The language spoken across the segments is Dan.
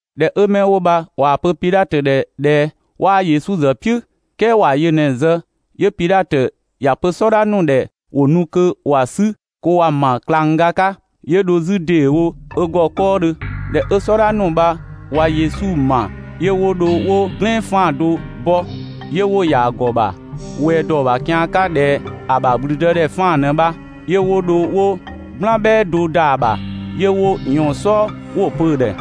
꞊Dhɛ 'ö 'mɛ 'wo bha ꞊waa‑ pö Pidhatö ‑dhɛ ꞊dhɛ 'waa Yesu ‑zë "piʋ̈ "kɛɛ ‑wa yö ꞊në‑ zë, 'yö Pidhatö ‑ya pö "sɔdha ‑nu ‑dhɛ ‑wo nu kö ‑wa 'sü kö ‑wa ‑ma ꞊klangga 'ka. ('Yö dho 'zü ‑deewo ö ‑gɔ 'kɔɔdhö.) ꞊Dhɛ 'ö "sɔdha ‑nu bha ꞊wa Yesu ‑ma, 'yö 'wo dho 'wo "glɛɛn 'faan‑ do bɔ, 'yö 'wo‑ ‑ya ‑gɔ ‑bha ꞊wɛɛ ‑dɔ ‑bha kian 'ka ꞊dhɛ ‑a ‑bha ‑gblüdëdhɛ 'faan‑ ꞊në bha. 'Yö 'wo dho 'wo "gblan "bhɛɛ do ‑da ‑bha, 'yö 'wo ꞊yɔɔn‑ "sɔɔ 'wo‑ pö‑ ‑dhɛ: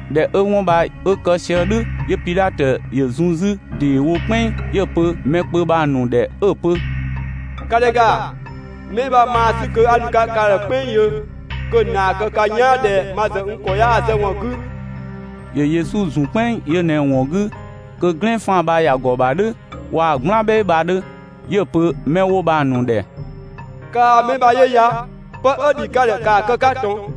꞊Dhɛ 'ö 'wɔn bha 'ö kë sië "dhʋ̈, 'yö Pidhatö ‑yö zun 'zü ‑dee wo "kpɛnng, 'yö‑ pö mɛ kpö bha‑ ‑nu ‑dhɛ 'ö‑ pö: «‑Ka ‑dhɛ ‑ga, 'mɛ bha maa‑ 'sü kö 'a nu‑ 'ka ka ‑dhɛ "kpɛnng yö kö‑ ‑naa kë ka "yaan ꞊dhɛ ma ‑zë n ‑kɔ 'yaa‑ zë ‑wɔn 'gü.» ‑Yö Yesu ‑zun "kpɛnng yö ꞊në‑ ‑wɔn 'gü kö "glɛɛn 'faan‑ bha ‑ya ‑gɔ ‑bha "dhʋ̈ waa‑ "gblan "bhɛɛ bha‑ ‑dhö. 'Yö‑ pö‑ 'mɛ 'wo bha‑ ‑nu ‑dhɛ: «Kaa‑ 'mɛ bha 'yö ya! ('Pë 'ö ‑dhi ka ‑dhɛ, ‑kaa kë‑ 'ka ꞊tɔn!)»»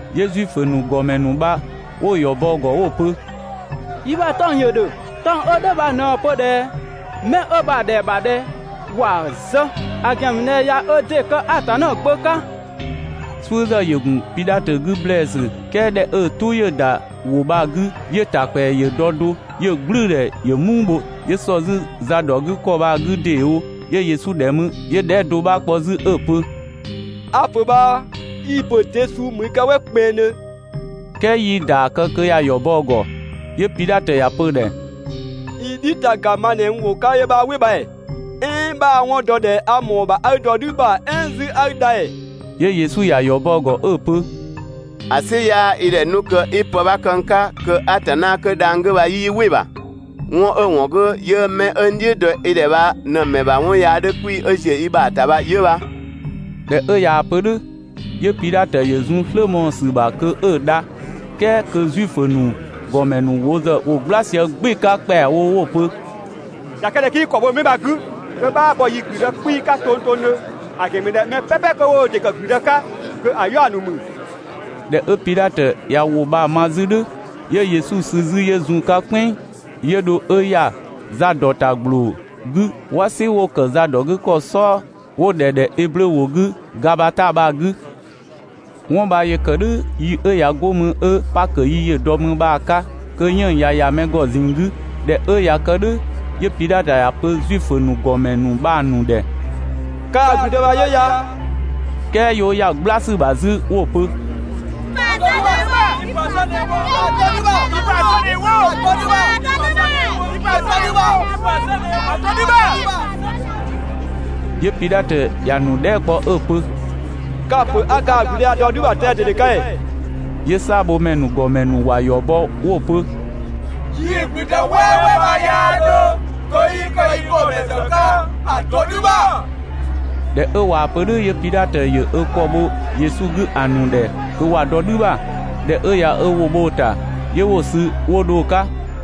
'Yö Zuifö ‑nu ‑gɔmɛ ‑nu bha 'wo‑ ‑yɔ bɔ‑ ‑gɔ 'wo‑ pö: «Yi ‑bha 'tɔng‑ ‑yö ‑dhö. 'Tɔng‑ 'ö "dhʋ̈ bha ꞊në‑ pö ꞊dhɛ mɛ 'ö bha‑ ‑dhɛa ‑bha ꞊dhɛ ‑wa zë, ‑a ‑gɛn ‑mü ꞊dhɛ ꞊ya ö ‑dɩ kë Atanna Gbö 'ka». "Suʋ̈ ‑zë ‑yö ‑gun Pidhatö 'gü ‑blɛɛsü "kɛɛ ꞊dhɛ 'ö‑ "tʋ ‑yö ‑da ‑wʋ bha‑ 'gü, 'yö‑ ‑ta ‑kpɛa ‑yö dɔ do. 'Yö‑ "gblʋ̈ʋ̈dhɛ ‑yö "muu bho, 'yö ‑sɔ 'zü za dɔ 'gü ‑kɔ bha‑ 'gü ‑deewo 'yö Yesu ‑dhɛ mü, 'yö‑ dhɛɛ" do 'bha kpɔ 'zü 'ö‑ pö: «A‑ ‑pö bhaa, i‑ ‑pö de suu ‑mü i 'ka "wɛ kpɛnngdhö?» "Kɛɛ 'yii‑ ‑yɔ bɔ kö ‑ya ‑yɔ bɔ‑ ‑gɔ. 'Yö Pidhatö ‑ya pö‑ ‑dhɛ: «I "dhi ‑taga ma ꞊në n ‑wʋ 'ka 'yö 'bhaa "wɩ bha ‑ee? "Ɛɛn 'bhaa‑ 'wɔn dɔ ꞊dhɛ a ‑mɔɔ ‑bha 'a i dɔ "dhü ‑bha "ɛɛn 'zü 'a i dha ‑ee?» 'Yö Yesu ‑ya ‑yɔ bɔ‑ ‑gɔ 'ö‑ pö: «‑A "sɩ 'yaa i ‑dhɛ 'nu kö 'i pë 'bha kë n 'ka kö Atanna 'kö dhang‑ 'gü bha 'yii "wɩ‑ ‑bha. 'Wɔn 'ö‑ ‑wɔn 'gü 'yö 'mɛ 'ö n "dhiʋ̈ dɔ i ‑dhɛ bha ꞊në‑ ‑mɛ ‑bha 'wɔn yaa 'dhö 'kpii‑ 'ö ‑ziö i ‑bha ‑ta bha 'yö bha.» ꞊Dhɛ 'ö ꞊yaa‑ pö "dhʋ̈, 'yö Pidhatö ‑yö zun‑ "slë mɔɔ‑ ‑sü ‑bha kö 'ö‑ dha, "kɛɛ kö Zuifö ‑nu ‑gɔmɛ ‑nu ‑zë ‑wo "gbla sië "gbɩɩ‑ 'ka ‑kpɛawo 'wo‑ pö: «꞊Ya kë ꞊dhɛ 'kii i ‑kɔ bho 'mɛ bha‑ 'gü, kö 'bhaa bɔ yii‑ ‑gblüdë 'kpiisü 'ka tongtongdhö, ‑a ‑gɛn ‑mü ꞊dhɛ mɛ "pɛpɛ 'kö 'wo wo ‑dɩ ‑kë ‑gblüdë 'ka kö‑ 'yaɔ‑ ‑nu ‑mü.» ꞊Dhɛ 'ö Pidhatö ꞊ya ‑wʋ bha‑ ma 'zü "dhʋ̈, 'yö Yesu sü 'zü 'yö zun‑ 'ka "kpɛnng, 'yö dho 'ö ‑ya za ‑dɔ ‑ta ‑gbloo 'gü "wasi 'wo‑ zadɔgükɔ "sɔɔ 'wo‑ ‑dhɛ ꞊dhɛ Eblö ‑wʋ 'gü Gabata bha‑ 'gü. 'Wɔn bha ‑yö ‑kë "dhʋ̈ yi 'ö ꞊ya 'go mü 'ö Pakö yi ‑yö dɔ mü bha‑ 'ka kö 'yënng‑ ꞊ya ‑ya mɛ ‑gɔ ꞊zinng 'gü. ꞊Dhɛ 'ö ꞊ya kë "dhʋ̈, 'yö Pidhatö ‑ya pö Zuifö ‑nu ‑gɔmɛ ‑nu bha‑ ‑nu ‑dhɛ: «Kaa‑ ‑gblüdë bha 'yö ya!» "Kɛɛ 'yö 'wo ‑ya "gbla ‑sü ‑bha 'zü 'wo‑ pö: «Yi‑ ‑pö ‑a zë ꞊në ‑yö wo, yi‑ ‑pö ‑a zë ꞊në wo, ‑a dɔ "dhü ‑bha!» 'Yö Pidhatö ‑ya ‑nu dhɛɛ" kpɔ 'ö‑ pö: «Ka‑ ‑pö 'a kaa‑ ‑gblüdë bha‑ dɔ "dhü ‑bha tɛan‑ ꞊dede 'ka ‑ee?» 'Yö "saabhomɛ ‑nu ‑gɔmɛ ‑nu ‑wa ‑yɔ bɔ 'wo‑ pö: «Yii‑ ‑gblüdë "wɛɛwɛɛ 'bha 'yaa 'dhö kö 'yii kë i ‑gɔmɛ ‑zë 'ka! ‑A dɔ "dhü ‑bha!» ꞊Dhɛ 'ö ꞊waa‑ pö "dhʋ̈ 'yö Pidhatö ‑yö ö ‑kɔ bho Yesu 'gü ‑a ‑nu ‑dhɛ kö ‑wa dɔ "dhü ‑bha. ꞊Dhɛ 'ö ꞊ya ö ‑wʋ bho‑ ‑ta, 'yö 'wo‑ sü 'wo dho‑ 'ka.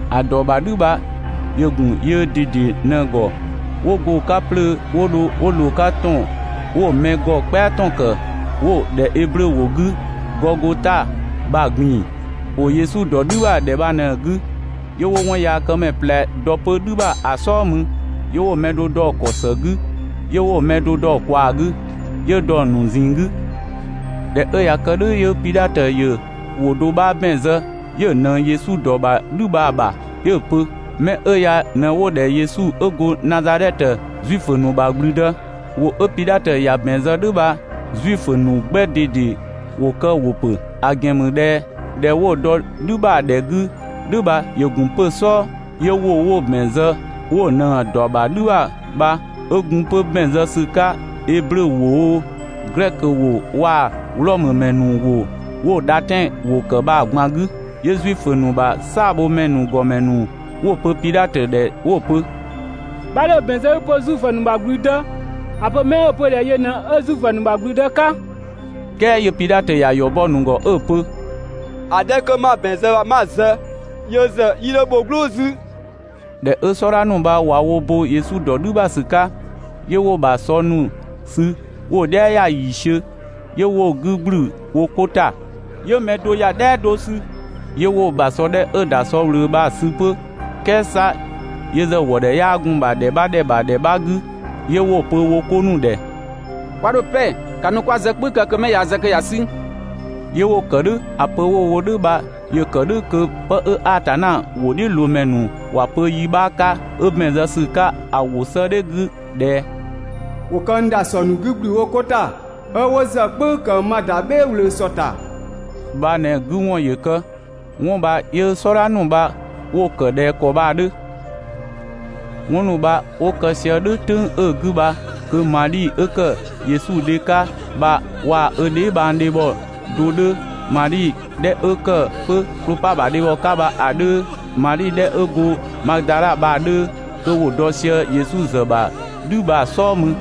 ‑A ‑dɔ ‑bha "dhü bha ‑yö ‑gun yöö ꞊dede ꞊në‑ ‑gɔ 'wo go‑ 'ka 'plöö 'wo dho 'wo ꞊loo‑ 'ka ‑tɔn 'wo‑ mɛ ‑gɔ "kpɛa ‑tɔn ‑kë, 'wo‑ ‑dhɛ Eblö ‑wʋ 'gü «Gɔgota» bha‑ ꞊gbin‑. ‑Wo Yesu ‑dɔ "dhü ‑bha ‑dhɛ bha ꞊në‑ 'gü, 'yö 'wo 'wɔnyaakëmɛ ꞊plɛ dɔ 'pö "dhü ‑bha ‑a "sɔɔ mü 'yö 'wo‑ mɛ do dɔ‑ ‑kɔ ‑së 'gü, 'yö 'wo‑ mɛ do dɔ‑ ꞊kwaa 'gü, 'yö dɔ‑ ‑nu ꞊zinng 'gü. ꞊Dhɛ 'ö ꞊ya kë "dhʋ̈ 'yö Pidhatö ‑yö ‑wʋ do 'bha ‑bɛn zë 'yö‑ ꞊nëng Yesu ‑dɔ ‑bha "dhü bha‑ ‑bha 'ö‑ pö: «'Mɛ 'ö ya ꞊në 'wo‑ ‑dhɛ Yesu 'ö go Nazadhɛtö, Zuifö ‑nu ‑bha ‑gblüdë». ‑Wʋ 'ö Pidhatö ‑ya ‑bɛn zë "dhʋ̈ bha Zuifö ‑nu 'gbɛ ꞊dede ‑wo kë‑ ‑wʋ ‑pö, ‑a ‑gɛn ‑mü ꞊dhɛ ‑dhɛ 'wo‑ dɔ "dhü ‑bha ‑a ‑dhɛ 'gü "dhʋ̈ bha ‑yö ‑gun 'pö‑ "sɔɔ, 'yö ‑wʋ 'wo‑ ‑bɛn zë 'wo ꞊nëng‑ ‑dɔ ‑bha "dhü ‑bha bha 'ö gun 'pö ‑bɛn zë ‑sü 'ka eblö ‑wʋ oo, glɛkö ‑wʋ waa‑ Wlɔmö ‑mɛ ‑nu ‑wʋ 'wo‑ dhatɛn ‑wʋ ‑kë bha‑ ꞊gban 'gü. 'Yö Zuifö ‑nu ‑bha "saabhomɛ ‑nu ‑gɔmɛ ‑nu 'wo‑ pö Pidhatö ‑dhɛ 'wo‑ pö: «'Bha 'dho‑ ‑bɛn zë 'i‑ pö Zuifö ‑nu ‑bha ‑gblüdë, ‑a pö 'mɛ 'ö‑ pö ꞊dhɛ yö ꞊në 'ö Zuifö ‑nu ‑bha ‑gblüdë 'ka.» "Kɛɛ 'yö Pidhatö ‑ya ‑yɔ bɔ‑ ‑nu ‑gɔ 'ö‑ pö: «‑A 'dhɛ 'kö 'ma‑ ‑bɛn zë bha 'ma‑ zë, (yö ‑zë 'yii 'dho bho "gblʋʋ 'zü). ꞊Dhɛ 'ö "sɔdha ‑nu bha ꞊wa wo bo Yesu ‑dɔ "dhü ‑bha ‑sü 'ka, 'yö 'wo‑ ‑bha sɔ ‑nu sü 'wo‑ "dhɛa ‑yiisiö ‑ya, 'yö 'wo‑ 'gü ‑gblü wo 'ko ‑ta, 'yö mɛ do ‑ya "dhɛa do sü. 'Yö 'wo‑ ‑bha sɔ 'dhɛ 'ö‑ ‑da sɔ ꞊wlöö bha‑ sü 'pö, "kɛɛ 'sa yö ‑zë ‑wɔ ‑dhɛ 'yaa gun‑ ‑bha ‑dhɛ 'bha ‑dhɛ ‑bha ‑dhɛ 'bha 'gü, 'yö 'wo‑ pö wo 'ko ‑nu ‑dhɛ: «'Kwa 'dho‑ "pɛ, ‑ka nu kö 'kwa‑ zë "kpʋ̈ü kë kö 'mɛ ꞊yaa‑ zë kö ‑ya 'sü!» 'Yö 'wo‑ ‑kë "dhʋ̈. ‑A pö 'wo‑ wo "dhʋ̈ bha ‑yö ‑kë "dhʋ̈ kö 'pë 'ö Atanna ‑wʋdhiʋ̈loomɛ ‑nu ‑wa pö yi 'bha 'ka, 'ö ‑bɛn zë ‑sü 'ka ‑a ‑wʋ 'sëëdhɛ 'gü ꞊dhɛ: «‑Wo kë n ‑dasɔ ‑nu 'gü ‑gblü wo 'ko ‑ta, 'ö 'wo zë "kpʋ̈ü ‑kë ma ‑da "bhɛɛ ꞊wlöö ‑sɔ ‑ta» bha ꞊në‑ 'gü ‑wɔn ‑yö kë. 'Wɔn bha 'yö "sɔdha ‑nu bha 'wo‑ ‑kë ꞊dhɛ ‑kɔ bha‑ 'dhö. 'Wɔn ‑nu bha 'wo kë sië "dhʋ̈ "tʋ̈ng 'ö‑ 'gü bha kö Madhi 'ö ‑kë Yesu dhe 'ka bha waa‑ ö dheebhang dhebhɔ do 'dhö, Madhi 'dhɛ 'ö ‑kë 'pö Klopa ‑bha dhebhɔ 'ka bha‑ 'dhö, Madhi 'dhɛ 'ö go Madadha bha‑ 'dhö, kö ‑wo dɔ sië Yesu ‑zë ‑bha ‑dhü bha‑ "sɔɔ mü.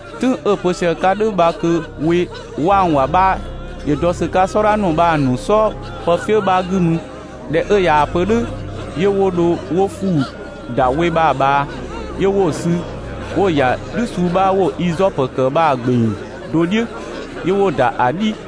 "Tʋ̈ng 'ö‑ pö sië‑ 'ka‑ "dhʋ̈ bha kö we 'wangwang 'bha ‑yö dɔ ‑sü 'ka "sɔdha ‑nu bha‑ ‑nu "sɔɔ pëfië 'bha 'gü mü. ꞊Dhɛ 'ö ꞊yaa‑ pö "dhʋ̈ 'yö 'wo dho 'wo ‑fuu ‑da we bha‑ ꞊bhaa, 'yö 'wo‑ sü 'wo‑ ‑ya "dhü suu 'bha 'wo‑ izɔpö ‑kë bha‑ ‑gbeng do "dhiʋ̈, 'yö 'wo‑ ‑da ‑a "dhi.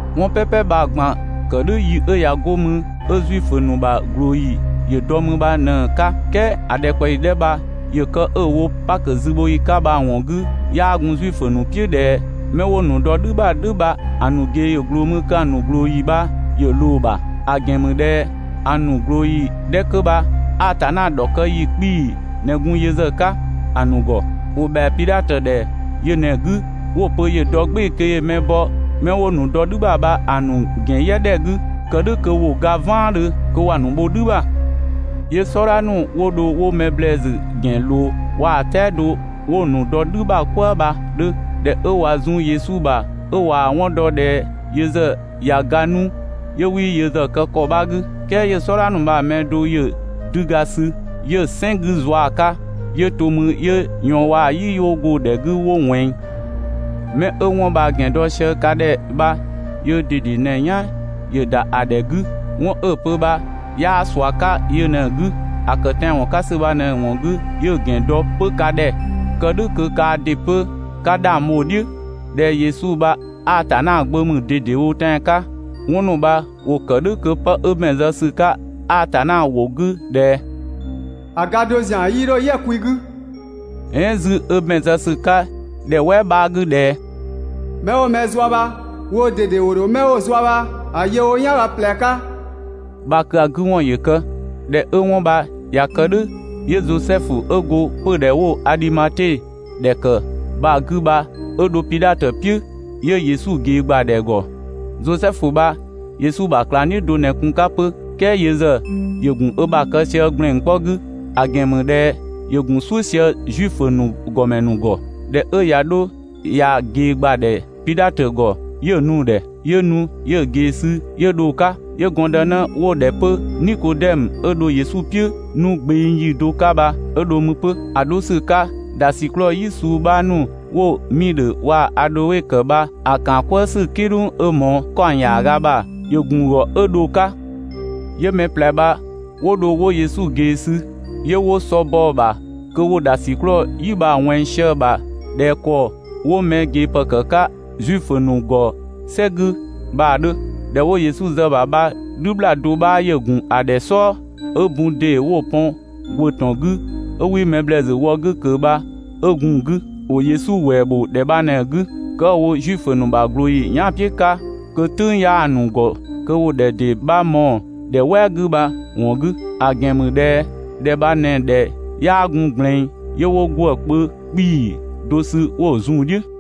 'Wɔn "pɛpɛ bha‑ ꞊gban‑ ‑kë "dhʋ̈ yi 'ö ꞊ya 'go mü 'ö Zuifö ‑nu ‑bha ꞊glooyi ‑yö dɔ mü bha ꞊në‑ 'ka ("Kɛɛ ‑a ‑dhɛkpaɔyi 'dhɛ bha ‑yö kë 'ö‑ wo Pakö zübhoyi 'ka bha‑ ‑wɔn 'gü), 'yaa gun Zuifö ‑nu "piʋ̈ ꞊dhɛ 'mɛ 'wo‑ ‑nu dɔ "dhü ‑bha "dhʋ̈ bha‑ ‑nu ꞊gee ‑yö ꞊gloo mü kö‑ ‑nu ꞊glooyi bha ‑yö ꞊loo‑ ‑bha. ‑A ‑gɛn ‑mü ꞊dhɛ ‑a ‑nu ꞊glooyi 'dhɛ 'kö bha Atanna ‑dhɔkë ‑yi 'kpii‑ ꞊në gun yö ‑zë 'ka ‑a ‑nu ‑gɔ. ‑Wo ‑bhɛa Pidhatö ‑dhɛ yö ꞊në‑ 'gü 'wo‑ pö ‑yö dɔ "gbɩɩ‑ kö ‑yö mɛ bɔ 'mɛ 'wo‑ ‑nu dɔ "dhü ‑bha bha‑ ‑nu ‑gɛn "yɛ ‑dhɛ 'gü, (kë "dhʋ̈ kö ‑wo ga "vaandhö) kö ‑wa ‑nu bho "dhü ‑bha. 'Yö "sɔdha ‑nu 'wo dho 'wo mɛ ‑blɛɛsü ‑gɛn ꞊loo waa‑ "tɛado 'wo‑ ‑nu dɔ "dhü bha "kwëë bha‑ 'dhö. ꞊Dhɛ 'ö ꞊wa zun Yesu ‑bha 'ö ꞊waa‑ 'wɔn dɔ ꞊dhɛ yö ‑zë ꞊ya ga 'nu, 'yö 'wii yö ‑zë kë ‑kɔ 'bha 'gü. "Kɛɛ 'yö‑ "sɔdha ‑nu bha‑ mɛ do ‑yö 'düga sü 'yö‑ "sɛn 'gü ꞊zua‑ 'ka, 'yö to 'yö ꞊yɔɔn waa‑ "yi 'wo go‑ ‑dhɛ 'gü 'wo ꞊wɛnng. 'Mɛ 'ö 'wɔn bha‑ ‑gɛn dɔ sië ka ‑dhɛ bha yöö ꞊dede ꞊në‑ "yan ‑yö ‑da ‑a ‑dhɛ 'gü. 'Wɔn 'ö‑ pö bha 'yaa ꞊sua 'ka yö ꞊në‑ 'gü. ‑A ‑kë tɛanwɔn 'ka ‑sü bha ꞊në‑ ‑wɔn 'gü 'yö‑ ‑gɛn dɔ 'pö ka ‑dhɛ, kë "dhʋ̈ kö kaa ‑dɩ 'pö 'ka 'dhang bho‑ "dhiʋ̈ ꞊dhɛ Yesu bha Atanna Gbö ‑mü ꞊dedewo tɛan‑ 'ka. 'Wɔn ‑nu bha ‑wo ‑kë "dhʋ̈ kö 'pë 'ö ‑bɛn zë ‑sü 'ka Atanna ‑wʋ 'gü ꞊dhɛ: «‑A ga do ‑zian 'yii 'dho "yɛ‑ kwi 'gü» "ɛɛn 'zü 'ö ‑bɛn zë ‑sü 'ka ‑dhɛ "wɛɛ 'bha‑ 'gü ꞊dhɛ: «'Mɛ 'wo mɛ zua bha woo ꞊dede ‑wo ‑dho 'mɛ 'wo‑ zua bha‑ yö wo "yanga ꞊plɛ 'ka» bha kö‑ 'gü ‑wɔn ‑yö kë. ꞊Dhɛ 'ö 'wɔn bha ꞊ya kë "dhʋ̈, 'yö Zosɛfu 'ö go 'pödhɛ 'wo‑ Adhimate ‑dhɛ ‑kë bha‑ 'gü bha 'ö dho Pidhatö "piʋ̈, 'yö Yesu ꞊gee ‑gbadhɛ ‑gɔ. Zosɛfu bha Yesu ‑bha ꞊klangdhiʋ̈ do ꞊në gun‑ 'ka 'pö, "kɛɛ yö ‑zë ‑yö ‑gun ö ‑bha kë sië ‑gblɛn 'kpɔ 'gü, ‑a ‑gɛn ‑mü ꞊dhɛ ‑yö ‑gun "suʋ̈ sië Zuifö ‑nu ‑gɔmɛ ‑nu ‑gɔ. ꞊Dhɛ 'ö ꞊ya 'dho ꞊yaa‑ ꞊gee ‑gbadhɛ Pidhatö ‑gɔ, 'yö‑ nu‑ ‑dhɛ. 'Yö nu 'yö‑ ꞊gee sü 'yö dho‑ 'ka. 'Yö gɔndënë 'wo‑ ‑dhɛ 'pö Nikodɛmö, 'ö dho Yesu "piʋ̈ 'nu gbeng yi do 'ka bha 'ö dho mü 'pö. ‑A 'dho ‑sü 'ka, ‑dhasiklɔɔ "yi suu 'bha ‑nu 'wo‑ miidhö waa‑ adhoe ‑kë bha‑ ‑kaan "kwëë ‑sü "kidhʋng 'ö ꞊mɔɔ ‑kaɔng ‑yaaga ‑bha ‑yö ‑gun ‑gɔ 'ö dho‑ 'ka. 'Yö mɛ ꞊plɛ bha 'wo dho 'wo Yesu sü, 'yö 'wo sɔ bɔ‑ ‑bha kö ‑wo ‑dhasiklɔɔ "yi bha‑ ꞊wɛnng sië‑ ‑bha ꞊dhɛ ‑kɔ 'wo mɛ ꞊gee ‑pë ‑kë 'ka Zuifö ‑nu ‑gɔ "sɛ 'gü bha‑ 'dhö. ‑Dhɛ 'wo Yesu zë‑ ‑bha bha "dhü ‑bhlaa do 'bha ‑yö gun‑ ‑dhɛ "sɔɔ, 'ö bun ‑dee 'wo‑ pɔn ‑gwë ‑tɔn 'gü, 'ö 'wii mɛ ‑blɛɛsü wɔ‑ 'gü ꞊kö bha 'ö gun‑ 'gü. ‑Wo Yesu ‑wɛɛ ‑bho ‑dhɛ bha ꞊në‑ 'gü, kë 'ö wo Zuifö ‑nu ‑bha ꞊glooyi yɛan" "piʋ̈ 'ka, kö "tʋ̈ng 'yaa‑ ‑nu ‑gɔ kö ‑wo ‑dhɛ ‑dee 'bha mɔɔ‑ ‑dhɛ "wɛɛ 'gü bha‑ ‑wɔn 'gü. ‑A ‑gɛn ‑mü ꞊dhɛ ‑dhɛ bha ꞊në‑ ‑dhɛ 'yaa gun ꞊gblɛɛn, ('yö 'wo ‑gwë kpö 'kpii‑ do sü 'wo‑ zun‑ "dhiʋ̈).